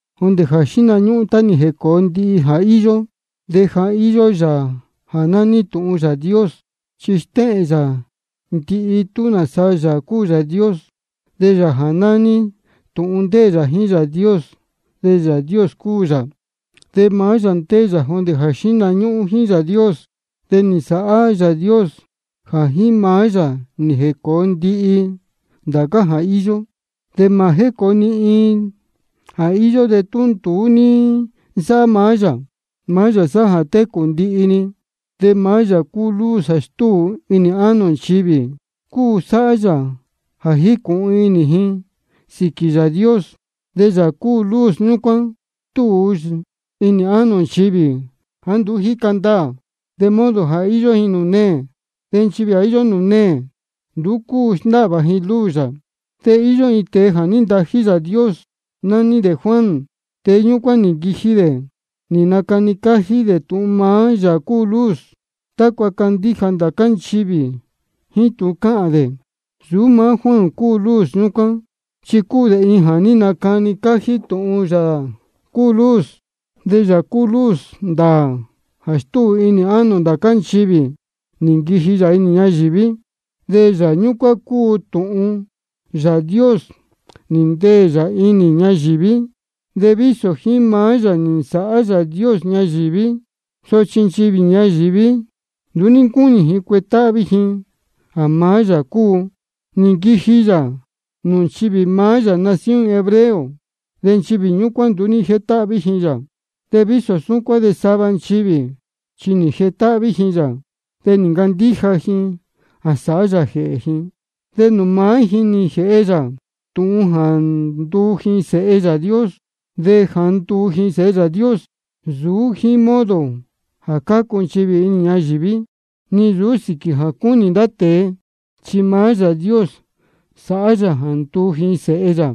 Jondē jā xíhna ñúhún tá nī jēcōo ndihi jā íyó, de ja íyó Yāā jā nání Tūhun Yāā Dios, chi stéhēn yā ndihi tūhun nāsa Yāā cúu Yāā Dios. De Yāā jā nání Tūhun ndéē yā jíín Yāā Dios, de Yāā Dios cúu yā. Maá yā ndéē yā jondē jā xíhna ñúhún jíín Yāā Dios. De nī nsāhá Yāā Dios jā jíín maá yā nī jēcōo ndihi ndācá jā íyó. De mā jécōo ni iin jā íyó de tú nduú ní nsáhá maá yā. Maá yā sáhá jā técū ndihi-ni, de maá yā cúu luz jā stúu inī ánō nchivī, cúu jā sáhá yā jā jícūhun inī ji sīquī Yāā Dios. De Yāā cúu luz ñúcuán stúu inī ánō nchivī jāá nduú jíca ndaā, de modo jā íyó ji nūū neē. De nchivī jā íyó nūū neē nduú cúu sndáhvā ji luz yā. De nī īyo iin tēe jā ní ntají Yāā Dios, nání dē Juan. Tēe ñúcuán nī nquiji dē nī nacani cájí dē tūhun maá Yāā cúu luz, tácua candíja ndācá nchivī jíín tūhun cáhān dē. Nsūú maá Juan cúu luz ñúcuán, chi cúu dē iin jā ní nacani cájí tūhun maá Yāā cúu luz. De Yāā cúu luz ndāā jā stúu inī ánō ndācá nchivī, nī nquiji yā inī ñayīví. De Yāā ñúcuán jā cúu Tūhun Yāā Dios nī ndeē yā inī ñayīví, de vísō jíín maá yā nī nsāhá Yāā Dios ñayīví, sochi nchivī ñayīví nduú ní ncúnī ji cuetáhví ji jā maá yā cúu. Nī nquiji yā nūū nchivī maá yā nación hebreo, de nchivī ñúcuán nduú ní jétáhví ji yā. De vísō súcuán de sava nchivī chi nī jetáhví ji yā, de nī ncandíja ji jā sāhá yā jēhē ji. De nūū maá ji nī jēhe yā tūhun jā nduu ji sēhe Yāā Dios. De jā ndúu ji sēhe Yāā Dios, nsūú jíín modo jā cácu nchivī inī ñayīví, ni nsūú sīquī jā cúnī ndá tēe, chi maá Yāā Dios sáhá yā jā ndúu ji sēhe yā.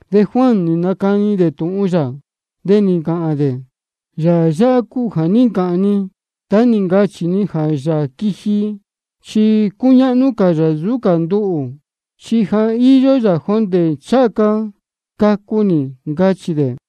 De Juan nī nacani dē tūhun yā, de nī ncāhān dē: Yāā yáhá cúu jā ní ncāhān ni tá nī ncachī ni jā Yāā quiji chi cúñáhnú cā yā nsūú cā nduhū, chi ja íyó yā jondē ncháha ca cacu nī, ncachī dē.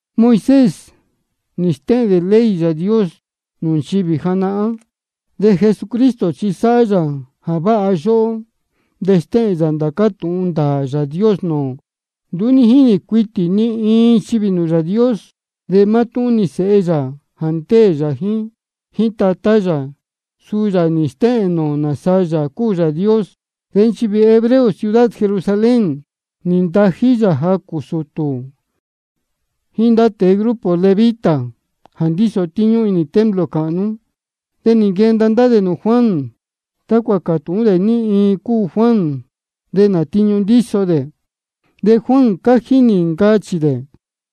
Moisés nī stéhēn dē ley Yāā Dios nūū nchivī janahán, de Jesucristo chi sa sáhá yā jā váha yóhó de stéhēn yā ndācá tūhun ndāā Yāā Dios nūū ō. Nduú ní jínī cuitī ni iin nchivī nūū Yāā Dios. De mátúhún-ni Sēhe yā jā ndéē yā jíín Tatá yā, suu yā nī stéhēn nūū ō nāsa Yāā cúu Yāā Dios. De nchivī hebreo ciudad Jerusalén, nī ntají ji jacū sūtū jíín ndá tēe grupo levita jā ndíso tíñú inī templo cāhnú. De nī nquenda ndá dē nūū Juan tácua cātūhún dē ní iin cúu Juan de nā tiñu ndíso dē. De Juan cájí nī ncachī dē: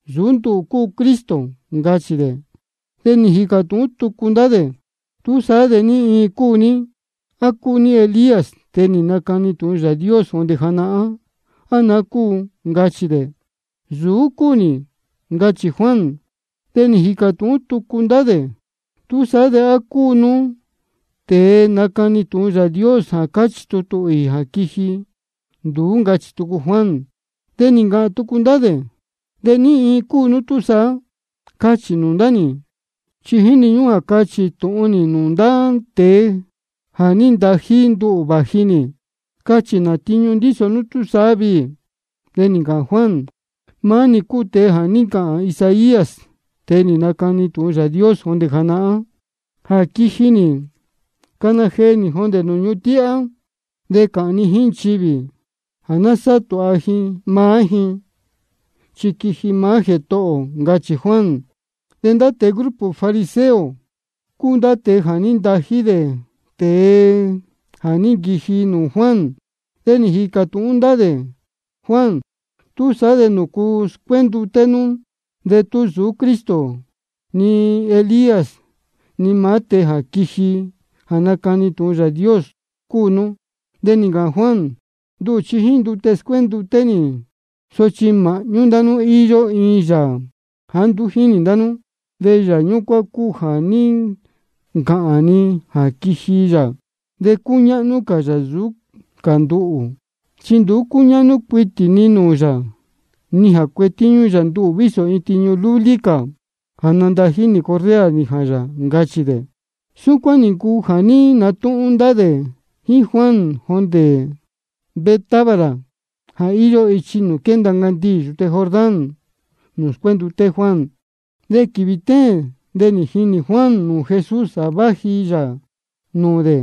Nsūú nduhū cúu Cristo, ncachī dē. De nī jīcā tūhún tucu ndá dē: ¿Túsaá de ní iin cúu nú? ¿A cúu nú Elías, tēe nī nacani tūhun Yāā Dios jondē janahán, á naá cúu? ncachī dē. Nsūú dē cúu nī, ncachī Juan. De nī jīcā tūhún tucu ndá dē: ¿Túsaá de á cúu nú tēe nácani tūhun Yāā Dios jā cáchī tutū īī jā quiji? Nduú, ncachī tucu Juan. De nī ncāhān tucu ndá dē: ¿De ní iin cúu nú túsaá? Cachī nūū ndá nī, chi jíni ñúhún jā cachī tūhun nī nūū ndá tēe jā ní ntají nduhū vāji nī. Cachī nā tiñu ndíso nú viī. De nī ncāhān Juan: Maá nī cúu tēe jā ní ncāhān Isaías, tēe nī nacani tūhun Yāā Dios jondē janahán, jā quiji nī cana jee nī jondē nūū ñuhun tíhá. De cáhān ni jíín nchivī jā ná sáhá tūha ji maá ji, chi quiji maá Jētohō ō, ncachī Juan. De ndá tēe grupo fariseo cúu jā ní ntají dē ndá tēe jā ní nquiji nūū Juan. De nī jīcā tūhún ndá dē Juan: ¿Túsaá de nūcu scuénduté nú de tú nsūú Cristo ni Elías ni maá tēe jā quiji jā nacani tūhun Yāā Dios cúu nú? De nī ncāhān Juan: Nduhū chi jíín ndute scuénduté nī. Sochi māhñú ndá nú íyó iin Yāā jāá nduú jínī ndá nú. De Yāā ñúcuán cúu jā ní ncāhān ni jā quiji yā de cúñáhnú cā yā nsūú cā nduhū. Chi nduú cúñáhnú cuitī ni nūū yā, ni jā cuetíñú yā nduhū vísō iin tiñu lúlí cā jā nandají nī correa nījān yā, ncachī dē. Súcuán nī ncuu jā ní natúhún ndá dē jíín Juan jondē Betábara jā íyó ichi nūū quénda ncandiī yūte Jordán, nūū scuénduté Juan. De quīvī téēn de nī jinī Juan nūū Jesús jā váji yā nūū dē.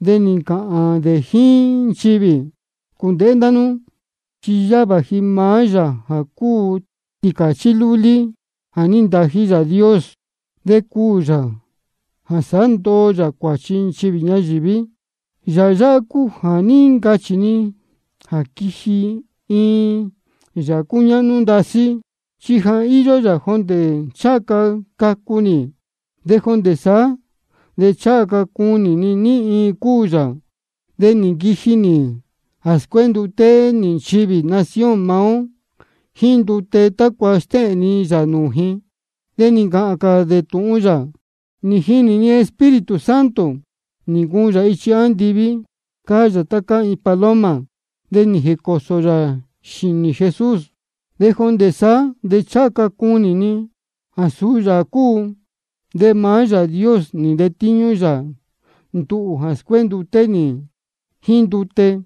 De nī ncāhān dē jíín nchivī: Cūndēhé ndá nú, chi yáhá vāji maá Yāā jā cúu Tīcāchí lúlí jā ní ntají Yāā Dios, de cuū yā jā sāhá ndoo yā cuāchi nchivī ñayīví. Yāā yáhá cúu jā ní ncachī ni jā quiji iin Yāā cúñáhnú ndasí, chi ja íyó yā jondē ncháha ca cacu nī. De jondē saá de ncháha ca cunī ni ní iin cúu yā, sochi nī nquiji nī jā scuénduté nī nchivī nación maá ó jíín ndute, tácua stéhēn ni yā nūū ji. De suni nī ncāhān cā dē tūhun yā: Nī jinī ni Espíritu Santo, nī ncuun yā ichi andiví, cáá yā tá cáá paloma, de nī jēcōsō yā xīnī Jesús. De jondē saá de ncháha ca cunī ni jā suu yā cúu. De maá Yāā Dios jā ní ntetíñú yā nduhū jā scuénduté nī jíín ndute,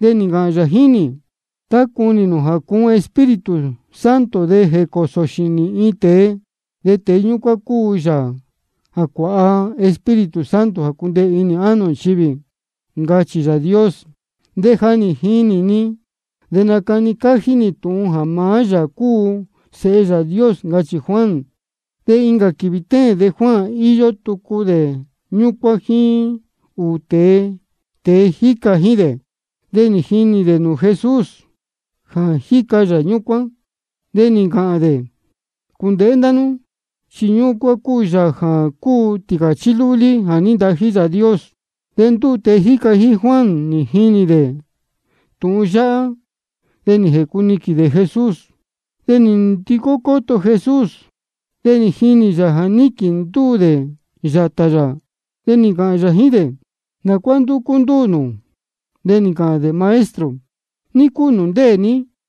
nī ncāhān yā jíín nī: Tá cunī nū jā cuun Espíritu Santo de jēcōsō xīnī iin tēe, suu tēe ñúcuán cúu Yāā jā cuāha Espíritu Santo jā cundeē inī ánō nchivī, ncachī Yāā Dios. De ja nī jinī ni, de nácani cájí nī tūhun jā maá yā cúu Sēhe Yāā Dios, ncachī Juan. De incā quīvī téēn de Juan íyó tucu dē ñúcuán jíín ūū tēe jíca jíín dē. De nī jinī dē nūū Jesús jā jíca yā ñúcuán. De nī ncāhān dē: Cūndēhé ndá nú, chi ñúcuán cúu maá Yāā jā cúu Tīcāchí lúlí jā ní ntají Yāā Dios. De ndúū tēe jíca jíín Juan nī jini dē tūhun yáhá, de nī jēcuniquīn dē Jesús. De nī ndicó cóto Jesús, de nī jinī yā jā níquīn ndúū dē yātā yā. De nī ncāhān yā jíín dē: ¿Nā cuá ndúcú ndúū nū? De nī ncāhān dē: Maestro, ¿ní cúu nūū ndéē ní?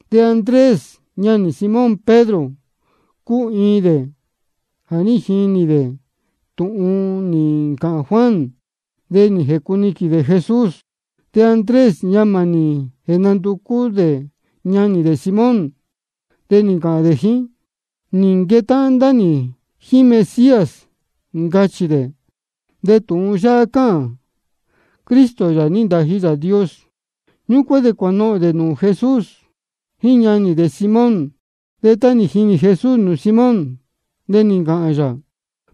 De Andrés, ñanī Simón Pedro, cúu iin dē jā ní jini dē tūhun nī ncāhān Juan de nī jēcuniquīn dē Jesús. De Andrés, ñamā nī jēnanducú dē ñanī dē Simón, de nī ncāhān dē jíín: Nī nquetáhán ndá nī jíín Mesías, ncachī dē. De tūhun yáhá cáhān: Cristo, Yāā nī ntají Yāā Dios. Ñúcuán de cuānohōn dē nūū Jesús jíín ñanī dē Simón. De tá nī jinī Jesús nūū Simón, de nī ncāhān yā: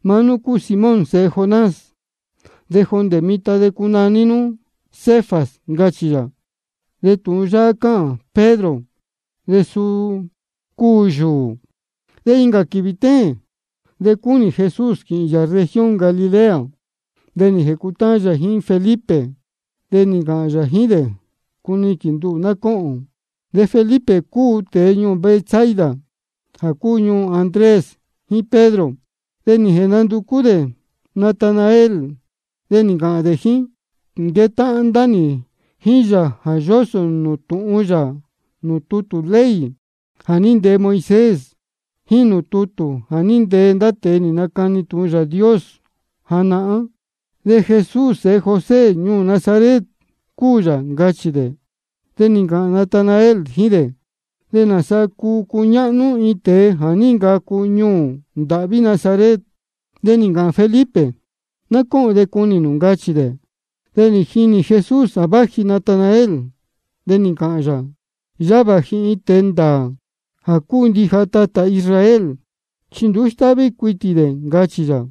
Maá nú cúu Simón sēhe Jonás. De jondē mitan de cunaní nú Cefas, ncachī yā. De tūhun yáhá cáhān: Pedro, de suu cúu yūū. De incā quīvī téēn de cúnī Jesús quīhīn yā región Galilea. De nī jēcutáhán yā jíín Felipe, de nī ncāhān yā jíín dē: Cuniquīn nduhū ná cóhōn. De Felipe cúu tēe ñuū Betsaida, jā cúu ñuū Andrés jíín Pedro. De nī jēnanducú dē Natanael, de nī ncāhān dē jíín: Nī nquetáhán ndá nī jíín Yāā jā yósō tūhun yā nūū tutū ley jā ní ntee Moisés, jíín nūū tutū jā ní ntee ndá tēe nī nacani tūhun Yāā Dios janahán. De Jesús sēhe José ñuū Nazaret cúu yā, ncachī dē. De nī ncāhān Natanael jíín dē: ¿De nāsa cúu cúñáhnú iin tēe jā ní ncacu ñuū ndāhví Nazaret? De nī ncāhān Felipe: Ná cóhōn de cunī nū, ncachī dē. De nī jinī Jesús jā váji Natanael, de ncāhān yā: Yáhá vāji iin tēe ndāā jā cúu ndija tatā Israel, chi nduú stáhví cuitī dē, ncachī yā.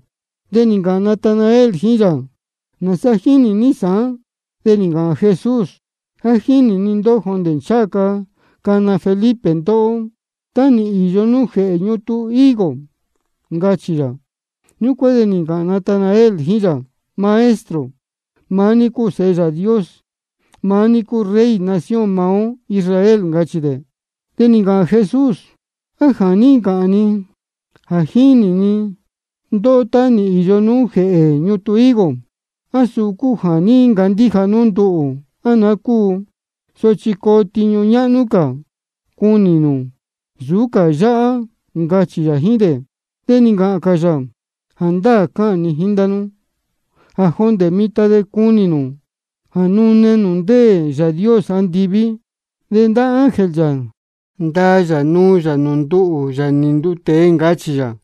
De nī ncāhān Natanael jíín yā: ¿Nāsa jínī ní sāán? De nī ncāhān Jesús: Ja nī jinī ni ndóhó jondē ncháha ca cana Felipe ndóhó, tá nī īyo nú jēhē ñutun higo, ncachī yā. Ñúcuán de nī ncāhān Natanael jíín yā: Maestro, maá ní cúu Sēhe Yāā Dios, maá ní cúu Rey nación maá ó Israel, ncachī dē. De nī ncāhān Jesús: ¿A jā ní ncāhān ni jā ní jinī ni ndóhó tá nī īyo nú jēhē ñutun higo, á suu cúu jā ní ncandíja nú nduhū, á naá cúu? Sochi coo tiñu ñáhnú cā cunī nū nsūú cā yáhá, ncachī yā jíín dē. De nī ncāhān cā yā: Jāndáā cáhān ni jíín ndá nú jā jondē mitan de cunī nū jā nune nūū ndéē Yāā Dios andiví, de ndá ángel yā ndaa yā nuu yā nūū nduhū, Yāā nī nduu tēe, ncachī yā.